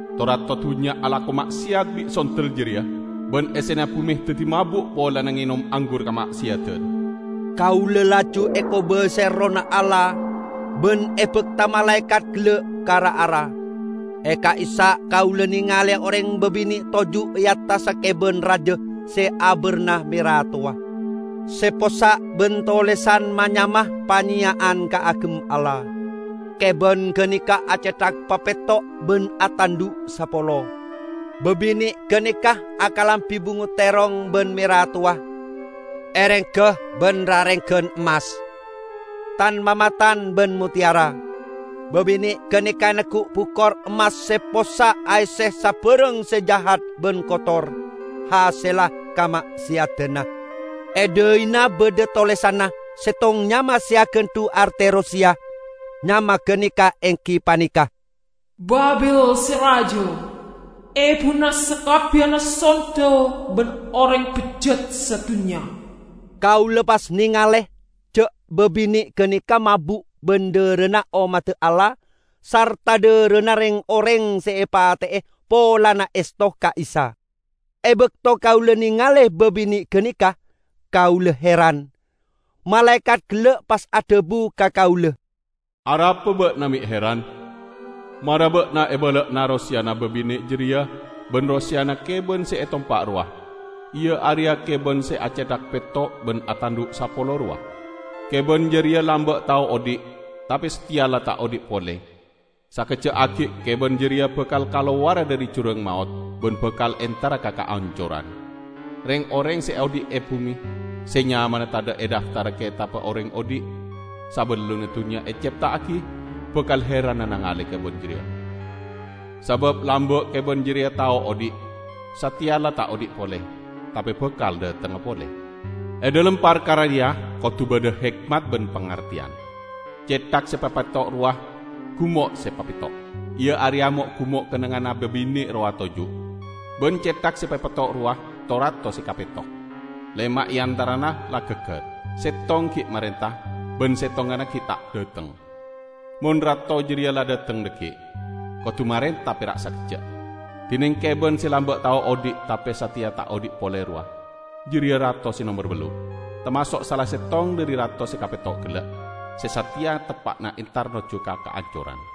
To-rato dunnya alako ma'seyat bi' sondel jareya, ban essena bume daddi mabu' polana ngenom anggur kama'seyadan." Kaula laju ekobasae Errohna Allah ban ebakta malaekat gella' ka ra-ara. E ka'issa' kaula nengale oreng babine' toju' e attassa keban raja se abarna mera towa, se possa' ban tolesan ma-nyama panyeya'an kaagem Allah. Keban ganeka acethak papetto' ban atandhu' sapolo. Babine' ganeka akalambi bungo terrong ban mera towa, erengga ban rarenggan emmas, tan-mamatan ban motteyara. Babine' ganeka neggu' bukor emmas se possa' aesse sabarang se jahat ban kotor, hasella kama'seyadanna. E dhaina badha tolesanna, settong nyama se agandhu' arte roseya. Nyama ganeka enggi paneka "Babil Se Raja, ebuna sakabbiyanna sondel ban oreng bejjat sadunnya." Kaula pas nengale ja' babine' ganeka mabu' ban dharana ommadda Allah sarta dharana reng-oreng se epate'e polana esto ka Isa. E bakto kaula nengale babine' ganeka, kaula heran. Malaekat gella' pas adhabu ka kaula, "Arapa ba'na me' heran? Mara ba'na ebala'ana roseyana babine' jareya ban roseyana keban se etompa' rowa, iya areya keban se acethak petto' ban atandhu' sapolo rowa. Keban jareya lamba' tao odhi', tape sateya la ta' odhi' pole. Sakejja' aggi' keban jareya bakal kalowara dhari jurang maot ban bakal entara ka kaancoran. Reng-oreng se odhi' e bume, se nyamana tadha' e dhaftarra Ketabba Oreng Odhi' sabellunna dunnya ecepta'agi bakal heranna nangale keban jareya. Sabab lamba' keban jareya tao odhi'. Sateya la ta' odhi' pole, tape bakal dhatengnga pole. E dhalem parkara reya kodu badha hekmat ban pangarteyan. Cethak se papetto' rowa gumo' se papetto'; iya areya mo'-gumo' kennengnganna babine' rowa toju'. Ban cethak se papetto' rowa to-rato se kapetto: lema' e antarana la gaggar, settong gi' marenta, ban settonganna gi' ta' dhateng. Mon rato jareya la dhateng dhaggi', kodu marenta pera' sakejja'. Dineng keban se lamba' tao odhi' tape sateya ta' odhi' pole rowa, jareya rato se nomer ballu'. Tamaso' sala settong dhari rato se kapetto gella', se sateya teppa'na entar nojju ka kaancoran.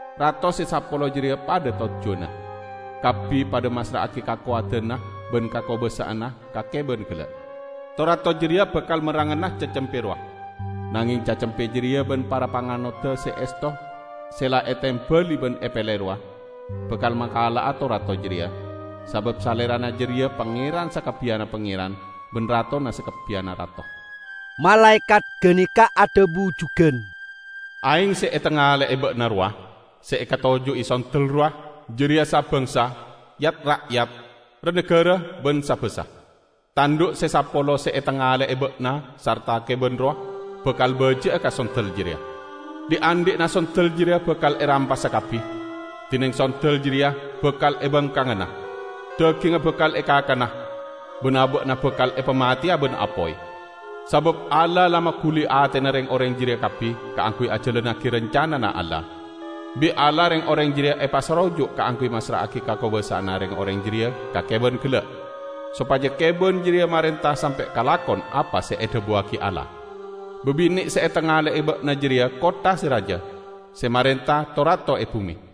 Rato se sapolo jareya padha tojjuwanna; kabbi padha massra'agi kakowadanna ban kakobasa'anna ka keban gella'. To-rato jareya bakal merrangana Cacempe rowa. Nangeng Cacempe jareya ban para panganodda se esto se la etembali ban epele rowa, bakal makala'a to-rato jareya, sabab Salerana jareya Pangeran sakabbiyanna pangeran ban Ratona sakabbiyanna rato." Malaekat ganeka adhabu jugan, "Aeng se etangale'e ba'na rowa, se ekatoju'i sondel rowa, jareya sa-bangsa, yat-ra'yat, ra-nagara ban sa-basa. Tandhu' se sapolo se etangale'e ba'na sarta keban rowa, bakal baji'a ka sondel jareya. Dhi'-andhi'na sondel jareya bakal erampasa kabbi, dineng sondel jareya bakal ebangkangana. Dagingnga bakal ekakana, ban aba'na bakal epamateya ban apoy. Sabab Allah la maguli atena reng-oreng jareya kabbi kaangguy ajalannagi rancanana Allah. Bi' Allah reng-oreng jareya epasaroju' kaangguy massra'agi kakobasa'anna reng-oreng jareya ka keban gella', sopaja keban jareya marenta sampe' kalakon apa se edhabuwagi Allah. Babine' se etangale'e ba'na jareya kottha se raja, se marenta to-rato e bume."